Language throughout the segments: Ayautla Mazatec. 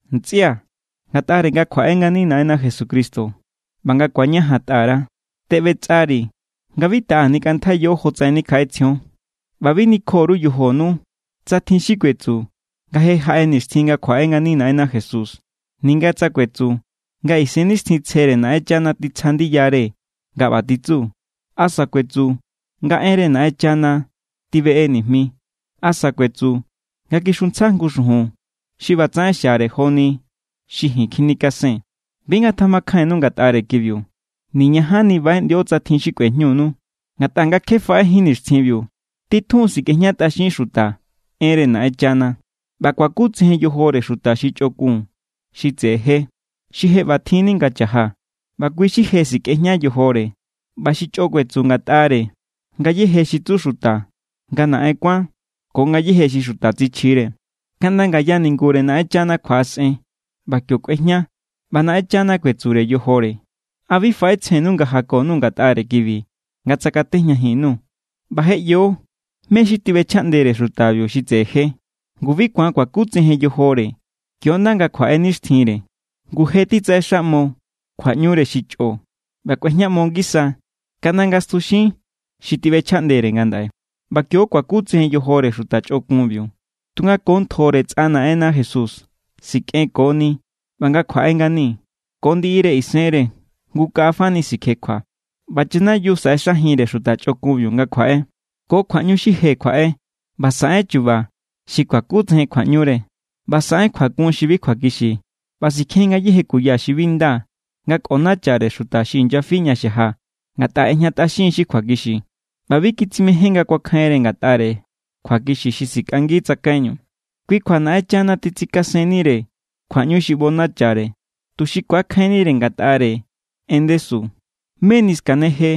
Ntsꞌia̱, ngatꞌare nga kjuaꞌe ngani Naꞌenna Jesucristo ꞌba nga ku̱añajantꞌa_ra, teꞌbetsꞌari̱ nga bi taꞌa nikꞌantjaiyo jotsaꞌen nikjaꞌetsjion. ꞌBa bi nikjo_ru yojonu tsa tjin xi kuetsu nga je jaꞌe nixtjin nga kjuaꞌe ngani Naꞌenna Jesús. Ninga tsa kuetsu nga Isennixtjintsjere Naꞌenchana titsja ndiyare nga ꞌba titsu asa kuetsu nga enre Naꞌenchana tibeꞌe nijmi, asa kuetsu nga kixuntsja jngu xujun xi ꞌbatsaꞌen xiare joni xi ji̱n kjinikasen, bi ngatjamakjainnu ngatꞌare kibiu. Niñajanni baꞌeꞌndio tsa tjin xi kꞌuejñunu. Ngatꞌa nga kje faꞌejín nixtjinbiu, titjun sikꞌejñatꞌaxin xuta enre Naꞌenchana, ꞌba kuakutsejen yojore xuta xi chꞌokun xi tseꞌe je, xi je ꞌba tjinni nga cha̱ja. ꞌBa kui xi je sikꞌejña yojore ꞌba xi chꞌo kuetsu ngatꞌare ngayéje xi tsu xuta nga naꞌen kuán ko ngayéje xi xuta tsichjire. Kaꞌnda ngaya ningure Naꞌenchana kjuaꞌasꞌen ꞌba kio kꞌuejña ꞌba Naꞌenchana kuetsure yojore. ¿A bi faꞌetsjennu nga jako_nuu̱ ngatꞌare kibi nga tsakatejñajin_nuu̱? ꞌBa je ꞌyo mé= xi tiꞌbechjaꞌndere xutabiu xi tseꞌe je, ngu bi ku̱an kuakutsejen yojore kio= ꞌnda nga kjuaꞌe nixtjinre. Ngu je titsaꞌexaꞌmo kjuaꞌñure xi chꞌo. ꞌBa kꞌuejñaꞌmo ngisa kaꞌnda nga stjuxin xi tiꞌbechjaꞌndere ngandaꞌe. ꞌBa kio= kuakutsejen yojore xuta chꞌokunbiu, tunga ko ntjore tsꞌa Naꞌenna Jesús sikꞌenkoni ꞌba nga kjuaꞌe ngani, ko ndiꞌire isenre jngu kaꞌa fani sikjekjua. ꞌBa chanayiu saꞌexajinre xuta chꞌokunbiu nga kjuaꞌe. Ko kjuaꞌñu xi je kjuaꞌe, ꞌba saꞌen chu̱ba̱ xi kuakutsejen kjuaꞌñure, ꞌba saꞌen kjuakun xi bi kjuakixi. ꞌBa sikjen= ngayéje kuya xi bi nda nga kꞌonachare xuta xi inyafi ña xaja ngatꞌa ꞌejñatꞌaxin= xi kjuakixi ꞌba bi kitsimején nga kuakjainre ngatꞌare kjuakixi xi sikꞌangi tsakaiñu. Kui= kjua Naꞌenchana titsikasennenire kjuaꞌñu xi ꞌbonachare, tuxi ku̱akjainnire ngatꞌare en ndesu. Meni skaneje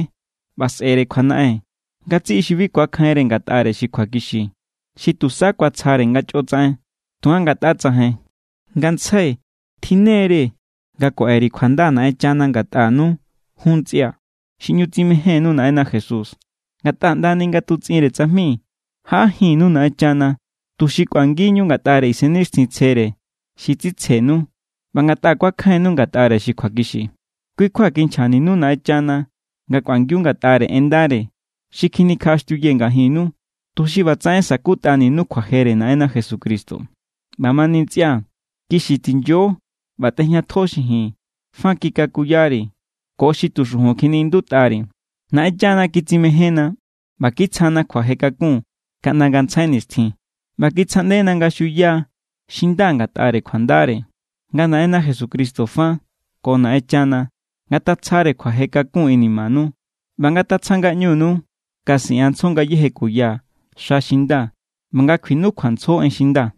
ꞌba sꞌe̱re kjuanaꞌen ngatsiꞌi xi bi kuakjainre ngatꞌare xi kjuakixi, xi tusa kuatsjare nga chꞌo tsaꞌen. Tunga ngatꞌa tsajain, ngantsjai tjinnere nga kuaꞌe_ri̱ kjuanda Naꞌenchana ngatꞌanu jun, ntsꞌia̱, xi ꞌñu tsimejénnu Naꞌenna Jesús. Ngatꞌa ꞌndani nga tutsꞌinre tsajmi, jaꞌajinnu Naꞌenchana, tuxi kꞌuangi=ñu ngatꞌare Isennixtjintsjere xi tsitsjenu ꞌba ngatꞌa kuakjainnu ngatꞌare xi kjuakixi. Kui= kjua kinchjaninu Naꞌenchana nga kꞌuangiu ngatꞌare en ndare xi kjinikjaꞌaxtiuyee̱ ngajinnu, tuxi ꞌbatsaꞌen sa̱kutꞌaninu kjuajere Naꞌenna Jesucristo. ꞌBamani ntsꞌia̱, kixi tinyo ꞌba tꞌejñatjo xi ji̱n fa kikakuyari̱ ko xi tu xujun kjiniꞌindutꞌari̱. Naꞌenchana kitsimejénna, ꞌba kitsjana kjuaje kakun kaꞌnda ngantsjai nixtjin, ꞌba kitsjaꞌndena nga xuya xi nda ngatꞌare kjuandare. Nga Naꞌenna Jesucristo fa ko Naꞌenchana ngatatsjare kjuaje kakun inimanu ꞌba ngatatsja ngaꞌñunu nga siꞌanntsjo ngayéje kuya xa xi nda ꞌba nga kjuinukjuantsjo en xi nda.